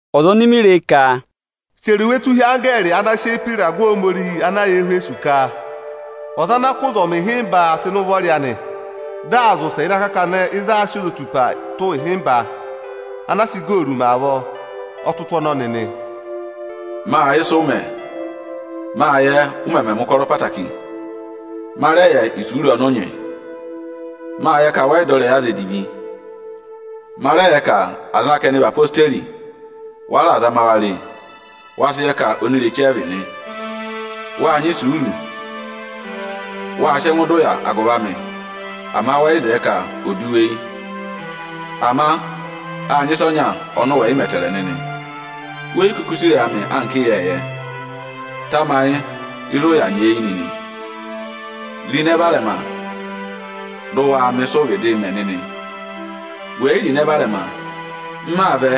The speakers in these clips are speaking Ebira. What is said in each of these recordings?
(Ọza oni mi re ka): Chẹrẹ iwe tụ́ hi anggẹẹrị ana sị eyi pe ịragụ Ohomorihi ana yà Ẹhwẹsọsị ka: Ọza ana kụ́ ụzọmị ịhịmba tụ́ ịnị ụvọ anị dị aa zị ụsẹ ịnị akakana ịzị aā sị ozotupaa tụ́ ịhịmba ana a sị igooru mẹ avọọ, ọ tụ́ mị ụtụ ọnọnị nị: Mâ yẹ ịsị ụụ̄ mẹ; mâ yẹ ụ mẹmẹ mẹ̀ ụkọrọ ẹtẹẹtẹrẹ. Ma rẹ yẹ isuuru ọnị ụ nyị. Mâ yẹ ka wẹ yị dọ ịrẹyị aza edivi. Ma rẹ yẹ ka aza ana ka ẹnị vị ezirẹma Ijeesu, wa raà zama wa re; wa sị yẹ ka onireche ẹ vị nị. Wâ nyị isuuru, wâ sị ẹngụ dọ ụya agụvị amị, ama wẹ yị zẹẹ ka ò du wu eyi nịnị. Ama â nyị ịsa ọnya ọnị ụ wẹ yị mẹ ẹtẹẹrẹ nịnị. We yi kuku sì ịrẹyị amị nịnị anka ịyẹẹyẹ. Tamayị ịzị ụ yà nyeeyi nịnị. Ro ịnẹ varẹma, dị ụ waa mẹ ịsị ụụ̄ vịdịị mẹ nịnị! We yi ro ịnẹ varẹma nịnị, m maa vẹ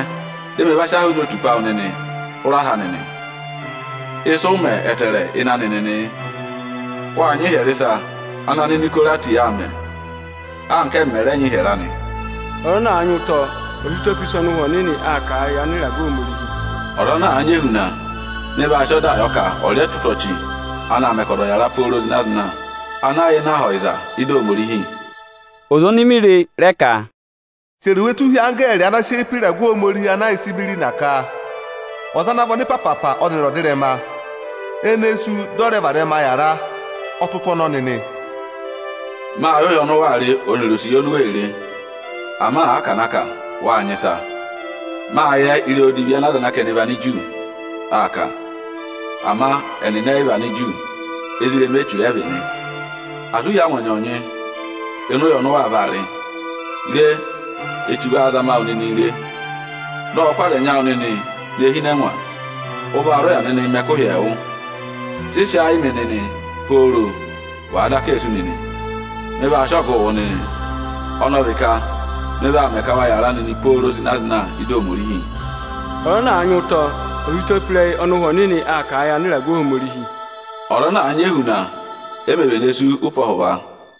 dị mị va sị aha ozotupa awụ nịnị hụrẹ aha anị nị. Ịsị ụ mẹ ẹtẹẹrẹ ịnị anị nịnị yị: Wâ nyị ịhyẹrẹ ịsa ana Aninikorati nịnị aa mẹ, anka ẹ́mị mẹ̀ rẹ nyị ịhyẹrẹ anị. Ọza ana àa nyị ụtọ, ọ̀ sị ụtọ pe ịsa ọnị ụhwẹ Ohomorihi aa kà a yị anịragụ Ohomorihi! Ọza ana àa nyị ehuna, mị vaa sị ọdaa yọ ka ọ̀ rị ẹtụtụ ọchị ana aā mẹ ka ọza ọ̀ yàra pooro zịna-zịna, ana yà ịnị Aha Ọyịza ịdị Ohomorihi. Ọza oni mi re ka, “Chẹrẹ iwe tụ́ hi anggẹẹrị ana sị eyi pe ịragụ Ohomorihi ana yà Ịsịmụna ka: Ọza ana vị ọnịpaapa ọnịrị ọdịrẹma, ene sú dị ọ rẹ varẹma yàra, ọ tụ́ ụtụ ọnọnị nị. Mâ yẹ ụya ọnị waa rị ọnịrị osiye oni u wee re; ama àa ka à na kà, wá nyị ịsa nịnị. Mâ yẹ ịrẹyị odivi ana aza ana ka ẹnị vị Aniju aa kà. Ama ẹnịnị ẹ yị vị Aniju, ezirẹma Echu ẹ̀ vị nị. Asị u hí angwa ọnyọọnyị ịnị ụya ọnị ụ waa vaa rị! Re, Echu vaa zama wụ nịnịị re, dị ọ kụ́ aza ẹnyị awụ nịnị ne hi ịnị ẹngwa. Ụ vaa rị ụya nịnịị mẹ̀ ẹkụhị ẹẹwụ. Sị sị ayị yị mị nịnị pooro, wàa daka ee sú nịnị! Mị vaa sị ọgụụ wụ nịnị, ọnị ọ vị ka mị vaa mẹ ka wa yàra nịnị pooro zịna-zịna ị́dị Ohomorihi. Ọza ana àa nyị ụtọ, ọ̀ sị ụtọ pe ịrẹyị ọnị Ụhwẹ Ohomorihi aa kà a yị anịragụ Ohomorihi! Ọza ana àa nyị ehuna, e mē vene sú ụpẹ ọhụva.”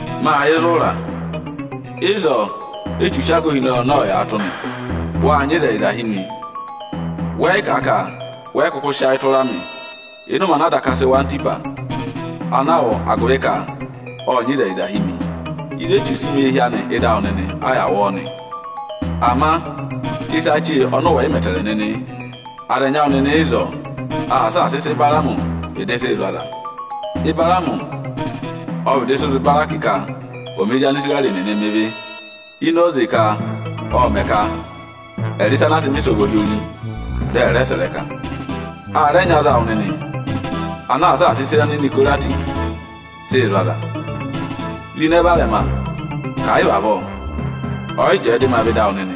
Ọnị ộ yẹ ịzị ụ ra nịnị, ịzọọ Échu sị aga ohinọyị anị yàatụ nị. Wâ nyị ịzẹyịza hi ọnị nịnị; wẹ yị kà ka wẹ yị kụkụ sị ayị tụra ọnị nịnị ịnị ụmẹ ana a daka sị wụ ọnọrụ ana aā hị́ Antipasi, ana a wụ agụvị ka ọ́ nyị ịzẹyịza hi ọnị. Ịzị Echu sị mẹ eehi anị ịdị awụ nịnị a yà wụ ọọ nị. Ama ịsa chee ọnị ụ wẹ̀ yị mẹ ẹtẹẹrẹ nịnị yị: Aza ẹnyị ịnị awụ nịnị ịzọọ aa saasa ịsị Ịbaraamị vịdị sị zụ̀ aza. Ịbaraamị ộ vịdị sị zụ̀ Ịbarakị ka ọ̀ mẹ ezi Anisirẹrị nịnị mẹ ịvị ini oze ka ộ mẹ̀ ka ẹ̀ rị ịsa ana a sị mẹ̀ ịsọvọ hi ori, dị ẹ̀ rẹẹ sẹ̀ ịrẹka. A rẹ nyị aza awụ nịnị ana aa saasa ịsa Aninikorati nịnị sị zụ̀ aza. Ro ịnẹ varẹma nịnị, ka à yị vị avọọ, ọ yị jẹẹ dị ma vẹ ịdị awụ nịnị,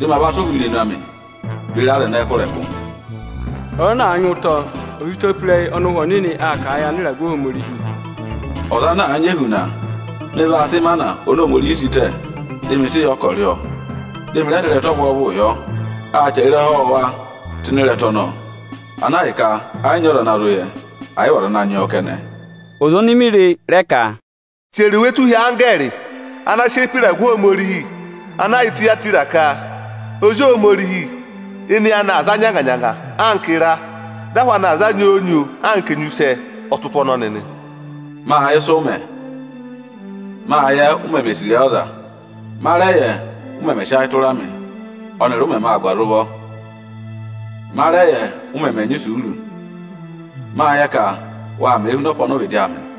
dị ma sị ụhwọ ana yà amị irenu beri aza ẹnẹẹ kụ́ ịrẹkụ. Ọza ana àa nyị ụtọ, ọ̀ sị ụtọ pe ịrẹyị ọnị Ụhwẹ Ohomorihi aa kà a yị anịragụ Ohomorihi! Ọza ana àa nyị ehuna, ọnị vaa sị ịmana oni Ohomorihi sị tẹ̀, dị ọnị sị yọ ka ọọ rị ọọ. Ọnị rẹ vaa sị ịrẹta ọvwọọvụụ yọ; â chẹrẹ ịrẹha ọwọọwa tụ́ ịnị ịrẹta ọnọọ, ana ahịka ẹ yị nyị ọza ana zụ yẹ ẹ, ẹ̀ yị vị ọza ana nyị ọọ kẹnẹ. Ọza oni mi re ka, “Chẹrẹ iwe tụ́ hi anggẹẹrị ana sị eyi pe ịragụ Ohomorihi ana yà Itiyatira ka: Ozi Ohomorihi oni eyi anị aa za nyanga-nyanga anka ịra, dị ahụ anị aa za nyoo-nyoo anka enyusẹ, ọ tụ́ ụtụ ọnọnị nị: Ọ kà Ọnị ộ yẹ ịsị ụ mẹ nịnị; Ọnị ộ yẹ, u meme sì ịrẹyị ọza nịnị. Ọnị ọ rẹ yẹ, ụ mẹmẹ sị ayị tụra ọnị nịnị, ọnịrị ụ mẹmẹ aa gụ́ aza ụvọ nịnị. Ọnị ọ rẹ yẹ, ụ mẹmẹ nyị isuuru nịnị. Ọnị ộ yẹ ka waa mẹẹ huna ọpa ọnị ụ vịdị aa mẹ nịnị.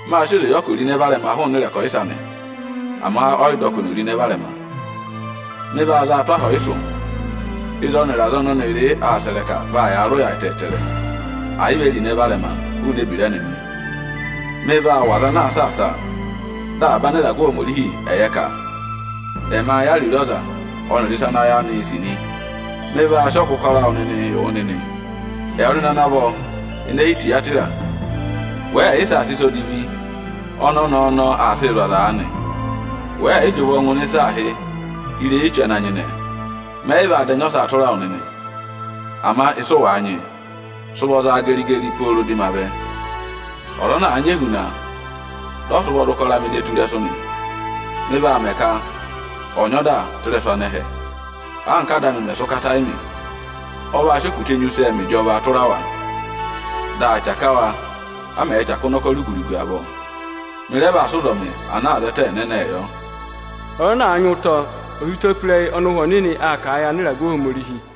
Ọnị ô sị oze yọ ka ò ro ịnẹ varẹma hụụnị ịrẹkọyịsẹ anị, ama ọ yị dọ ka oni ò ro ịnẹ varẹma. Ọ kà, Ọnị vaa za a tụ́ aha ọyịsụ ịzị ọnịrị aza ọnị ọnịrị aa sẹ̀ ịrẹka, vaa yaa rị ụya ẹtẹẹtẹrẹ, ẹ̀ yị vị o ro ịnẹ varẹma hụụnị ebira ẹnịnị. Ọnị vaa wụ̀ aza ana aa saasa a, dị avaba anịragụ Ohomorihi ẹ̀ yẹ ka ẹmaa yẹ ariro aza ọnịrị ịsa ana ayị anị sì nị. Mị vaa sị ọgụ ụkọrọ awụ nịnịị yị wụ nịnị. Ẹwụ nịnị ana vọ ene hi Itiyatira, wẹẹ̀ yị saasa ịsa odivi ọnị ọnẹẹ ọnọọ aa sịị zụ̀ aza nịnị. Wẹẹ̀ yị jị ụvọ ngụ ịrẹyị Echu ana nyịnẹ. Mẹ yị vaa da ẹnya ọsaa tụra wụ nịnị. Ama ịsị ụ wàa nyị, sị ụvọ geri-geri pooro dị ma vẹ. Ọ kà, Ọza ana àa nyị ehuna, dọ ọ sị ụvọ za ụkọrọ anị ne tù ịrẹsụ nị, ọnị vaa mẹ ka ẹ̀ nyị ọda tụ́ ịrẹsụ anẹhẹ, anka Áda anị mẹ̀ sị ụkata yị ọnị. Ọ vaa sị okutẹ enyusẹ mẹ ịjọvaa tụra wa. Dị aa chaka wa, a mẹ̀ẹ chaka ụnọkọ rugu-rugu avọọ. Ọnị rẹ vaa sị ụzọmị ẹnẹnẹ anaā zẹtẹẹ yị wa. Ọza ana àa nyị ụtọ, ọ̀ sị ụtọ pe ịrẹyị ọnị Ụhwẹ Ohomorihi aa kà a yị anịragụ Ohomorihi!”